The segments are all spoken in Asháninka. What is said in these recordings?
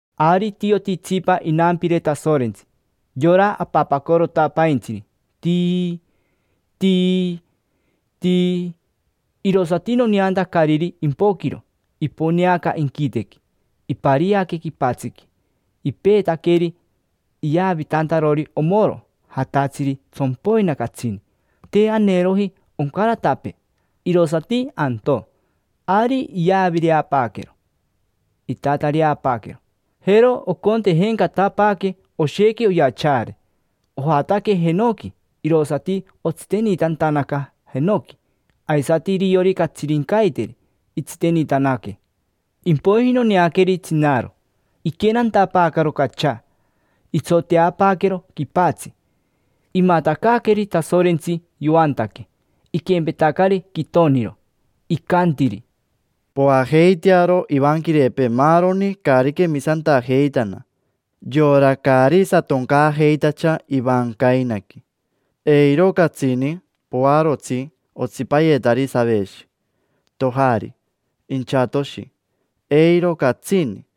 Ari itioti itsipa inampire Tasorentsi, yora apapacorotapaintsiri, tii, tii, tii. Irosati noneantacariri impoquiro, iponeaca inquitequi, ipariaque quipatsiqui. Ipeetaqueri iyavitantarori omoro jatatsiri tsompoina catsini, te aneeroji oncaratapee, irosati antoo. Ari iyavireapaaquero, itatareapaaquero, jero ocontejencatapaaque oshequi oyachaare. Ojataque jenoqui irosati otsitenitantanaca jenoqui, aisati iriori catsirincaiteri itsitenitanaque. Impoiji noneaqueri tsinari, iquenantapaacaro cachaa, itsoteapaaquero quipatsi, imatacaaqueri Tasorentsi yoantaque, iquempetacari quitoniro. Icantiri: —Poajeitearo ivanquirepee maaroni caari quemisantajeitana, yora caari satoncaajeitacha ivancainaqui. Eiro catsini poarotsi otsipayetari saveshi, tojari, inchatoshi, eiro catsini.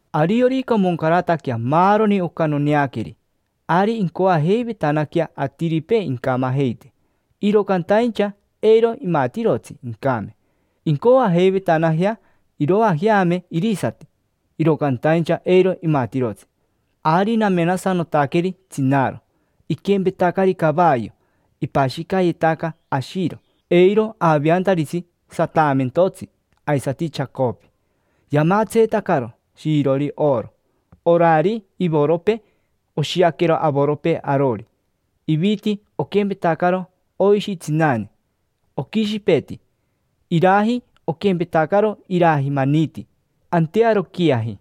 Ariorica omoncarataquea maaroni oca noneaqueri, ari incoajeivetanaquea atiripee incamajeite; iro cantaincha eiro imatirotsi incame. Incoajeivetanajea iroajeame irisati, iro cantaincha eiro imatirotsi. Ari namenasanotaqueri tsinari: iquempetacari cavayo, ipashicayetaca ashiro eiro aveantaritsi sataamentotsi aisati chacopi. Yamatseetacaro shiirori oro. Orari ivoropee oshiaquero avoropee arori. Iviti oquempetacaro oishi tsinane, oquishipeti. Iraji oquempetacaro iraji maniti, antearoquiaji.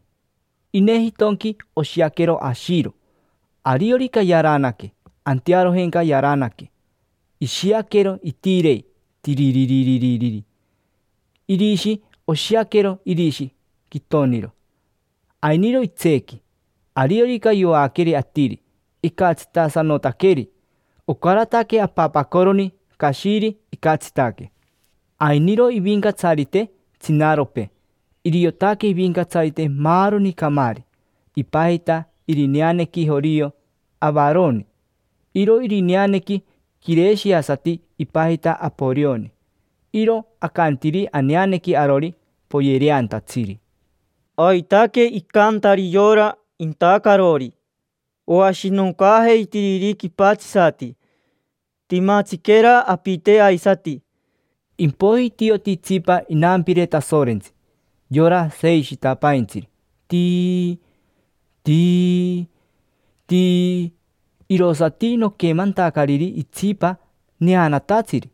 Inejitonqui oshiaquero ashiro, ariorica yaranaque, antearojenca yaranaque, ishiaquero itirei, tiriririri. Irishi oshiaquero irishi quitoniro, ainiro itseequi. Ariorica yoaqueri atiri, icatsitasanotaqueri, ocarataque apapacoroni cashiri icatsitaque. Ainiro ivincatsarite tsinaripee: iriotaque ivincatsarite maaroni camaari. Ipajita irineanequi jorio Avaroni; iro irineanequi quireshiasati ipajita Aporioni. Iro acantiri aneanequi arori: Poyereantatsiri. Aitaque icantari yora intacarori oashinoncaajeitiriri quipatsisati. Timatsiquera apite aisati. Impoiji itioti itsipa inampire Tasorentsi, yora seishitapaintsiri, tii, tii, tii; irosati noquemantacariri itsipa neanatatsiri.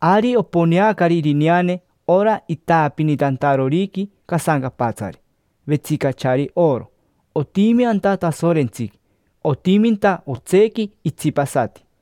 Ari oponeacari irineane ora itaapinitantaroriqui casancapatsari, vetsicachari oro. Otimi anta Tasorentsiqui, otiminta otseequi itsipasati.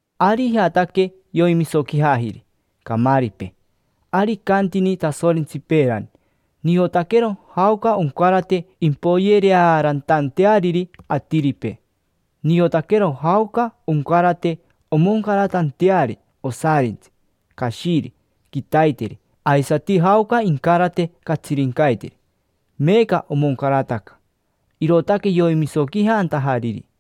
Ari ijataque, yoimisoquijajiri camaaripee. Ari icantini Tasorentsi peerani: “Niotaquero jaoca oncarate impoyereaarantanteariri atiripee. Niotaquero jaoca oncarate omoncaratanteari osarintsi, cashiri, quitaiteri, aisati jaoca incarate catsirincaiteri”. Meeca omoncarataca, irootaque yoimisoquijantajariri.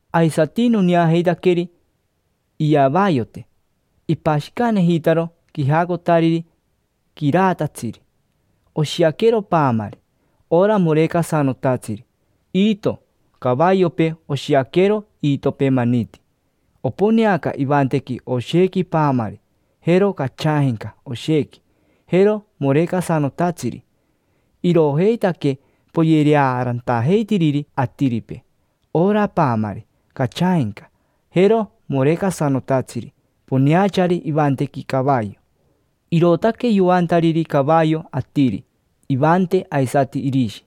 Aisati noneajeitaqueri iyavayote. Ipashicanejitaro quijacotariri quiraatatsiri, oshiaquero paamari, ora morecasanotatsiri. Iito cavayopee oshiaquero iitopee maniti. Oponeaca ivantequi oshequi paamari, jero cachaajenca oshequi, jero morecasanotatsiri. Iroojeitaque poyereaarantajeitiriri atiripee: ora paamari, cachaajenca, jero morecasanotatsiri poneachari ivantequi cavayo. Irootaque yoantariri cavayo atiri: ivante aisati irishi.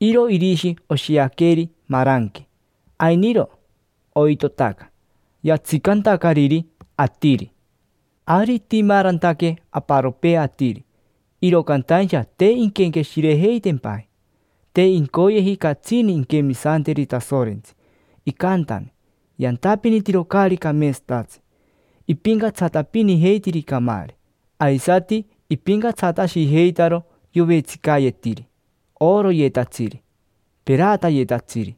Iro irishi oshiaqueri maranque, ainiro oitotaca, yatsicantacariri atiri. Ari itimaarantaque aparopee atiri, iro cantaincha te inquenqueshirejeitempaji: te incoyeji catsini inquemisanteri Tasorentsi. Icantani yantapinitiro caari cameetsatatsi, ipincatsatapinijeitiri camaari, aisati ipincatsatashijeitaro yovetsicayetiri: oroyetatsiri, peratayetatsiri,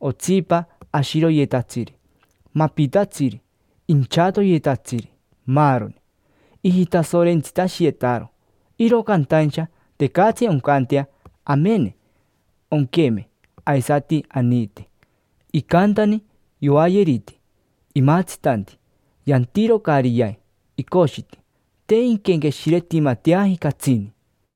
otsipa ashiroyetatsiri, mapitatsiri, inchatoyetatsiri, maaroni. Ijitasorentsitashiyetaro, iro cantaincha tecatsi oncantea amene, onqueme, aisati aniite. Icantani yoayeriti, imatsitanti, yantiro caari yai, icoshiti. Te inquenqueshiretimateaji catsini.